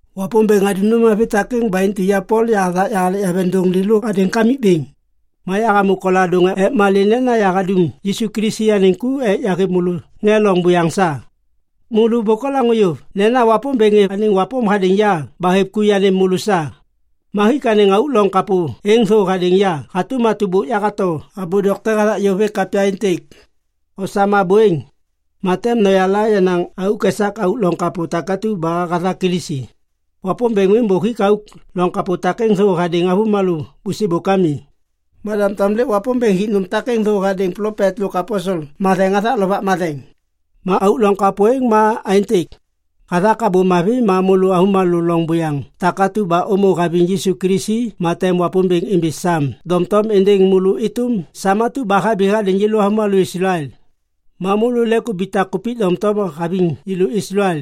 Wapômbêŋ hadum nôm mavi takêŋ ba intu ya Pol yahathak yahalek yaveŋdôŋ lêlô hadêŋ Kamikbêŋ. Ma yahamô koladôŋ ek malê nena yahadum Yisu Kilisi anêŋ ku ek yahêv môlô ŋê loŋ buyaŋ sa. Môlô bôk olaŋô yôv nena Wapômbêŋ hêv anêŋ wapôm hadêŋ ya ba hêv ku yanêm môlô sa. Ma hik anêŋ auk loŋ kapô êŋ thô hadêŋ ya hatôm atu ba bôk yahato abô dokte hathak yôv hêk kapya êntêk. Osam abô êŋ, ma tem noyala yenaŋ auk esak auk loŋ kapô takatu ba hathak Kilisi. Wapômbêŋ miŋ bôk hik auk loŋ kapô takêŋ thô hadêŋ avômalô bôsêbôk ami. Ma doŋtom lêk Wapômbêŋ hik nôm takêŋ thô hadêŋ anêŋ plopet lôk aposel matheŋ hathak Lovak Matheŋ. Ma auk loŋ kapô êŋ ma aêntêk. Hathak Abô Mavi ma môlô avômalô loŋ buyaŋ takatu ba ômô haviŋ Yisu Kilisi ma tem Wapômbêŋ imbi sam doŋtom êndêŋ môlô êtôm sam atu ba habi hadêŋ yêlô avômalô Islael. Ma môlô lêk ubitak kupik doŋtom haviŋ yêlô Islael.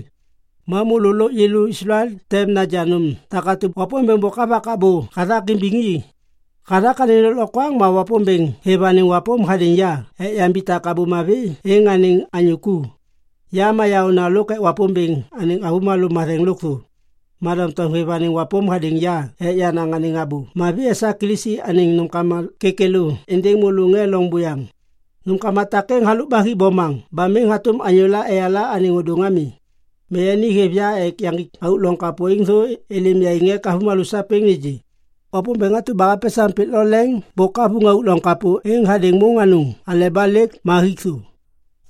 Ma môlô lôk yêlô Islael tem naja nôm takatu ba Wapômbêŋ bôk havak abô hathak imbiŋ i. Hathak anêŋ lôklokwaŋ ma Wapômbêŋ hêv anêŋ wapôm hadêŋ ya ek yambitak Abô Mavi êŋ anêŋ anyô ku. Ya ma yaôna lôk ek Wapômbêŋ anêŋ avômalô matheŋ lôkthô, ma doŋtom hêv anêŋ wapôm hadêŋ ya ek yanaŋ anêŋ Abô Mavi esak Kilisi anêŋ nômkama kêkêlô êndêŋ môlô ŋê loŋ buyaŋ. Nômkama takêŋ halôk ba hi bomaŋ ba miŋ hatôm anyôla eyala anêŋ ôdôŋ ami. Ma yani hêv ya ek yaŋgik auk loŋ kapô êŋ thô êlêm yaiŋ ek avômalô sapêŋ nêgê. Wapômbêŋ atu ba hapesaŋ pik lo leŋ bôk havuŋ auk loŋ kapô êŋ hadêŋ môŋ anôŋ aleba lêk ma hik thô.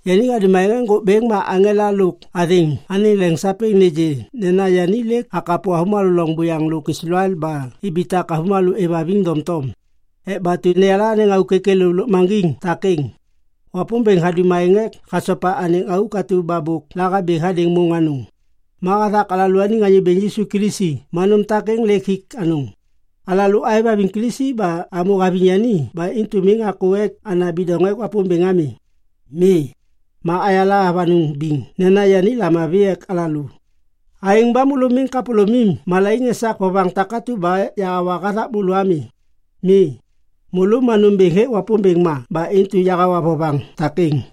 Yani hadum aêŋ ek ŋgôk bêŋ ma aŋela lôk athêŋ anêŋ leŋ sapêŋ nêgê nena yani lêk hakapo avômalô loŋ buyaŋ lôk Islael ba ibitak avômalô êvhaviŋ doŋtom. Ek batu neyala anêŋ auk kêkêlô lôkmaŋgiŋ takêŋ. Wapômbêŋ hadum aêŋ ek hasopa anêŋ auk atu ba bôk lahabi hadêŋ môŋ anôŋ. Ma hathak alalôaniŋ Anyô Bêŋ Yisu Kilisi ma nôm takêŋ lêk hik anôŋ. Alalô aêvhaviŋ Kilisi ba amô haviŋ yani ba intu miŋ akô ek ana bidoŋ ek Wapômbêŋ ami. Mi, ayala avanôŋ biŋ nena yani lamavi ek alalô. Aêŋ ba môlô miŋ kapôlômim malaiŋ esak vovaŋ takatu ba yahawa hathak môlô ami. Mi, môlô ma nômbêŋ hêk Wapômbêŋ ma ba intu yahawa vovaŋ takêŋ.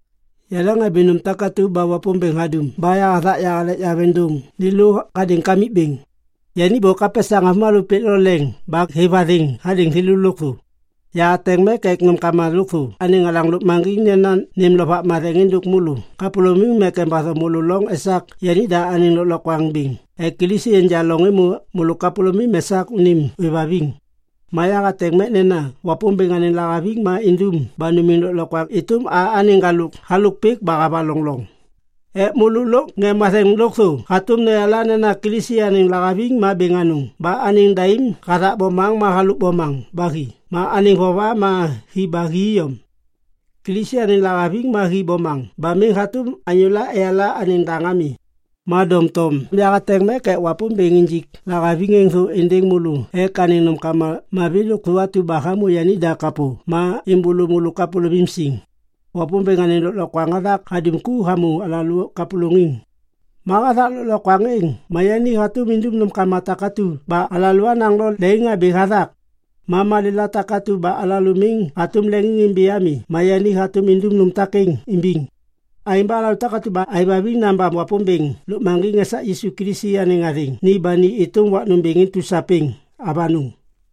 Yaleŋhabi nôm takatu ba Wapômbêŋ hadum ba yahathak yahalek yaveŋdôŋ lêlô hadêŋ Kamikbêŋ. Yani bôk hapesaŋ avômalô pik lo leŋ ba hêv athêŋ hadêŋ thêlô lôkthô. Yahateŋ mek ek nômkama lôkthô anêŋ alaŋ lôkmaŋgiŋ nena nêm Lovak Matheŋ êndôk môlô kapôlômim ek embatho môlô loŋ esak yanida anêŋ lôklokwaŋ bêŋ ek Kilisi enja loŋ êmô môlô kapôlômim esak unim ôêvhaviŋ. Ma yahateŋ mek nena Wapômbêŋ anêŋ lahaviŋ ma indum ba numiŋ lôklokwaŋ êtôm a anêŋ ŋgalôk halôk pik ba havaloŋ loŋ ek môlô lôk ŋê matheŋ lôkthô hatôm noyala nena Kilisi anêŋ lahaviŋ ma bêŋ anôŋ ba anêŋ daim hathak bomaŋ ma halôk bomaŋ ba hi ma anêŋ vova ma hi ba hi iyom. Kilisi anêŋ lahaviŋ ma hi bomaŋ ba miŋ hatôm anyôla eyala anêŋ daŋ ami. Ma doŋtom yahateŋ mek ek Wapômbêŋ injik lahaviŋ êŋ thô êndêŋ môlô ek anêŋ nômkama mavi lôkthô atu ba hamô yanida kapô ma êmbôlô môlô kapôlômim siŋ. Wapômbêŋ anêŋ lôklokwaŋ hathak hadum ku hamô alalô kapôlôŋiŋ. Ma hathak lôklokwaŋ êŋ ma yani hatôm indum nômkama takatu ba alalô anaŋ lo leŋiŋhabi hathak. Ma malêla takatu ba alalô miŋ hatôm leŋiŋimbi ami ma yani hatôm indum nôm takêŋ imbiŋ. Aêŋ ba alalô takatu ba aêvhaviŋ nabam Wapômbêŋ lôkmaŋgiŋ esak Yisu Kilisi anêŋ athêŋ ni ba ni êtôm wak nômbêŋ intu sapêŋ. Avanôŋ.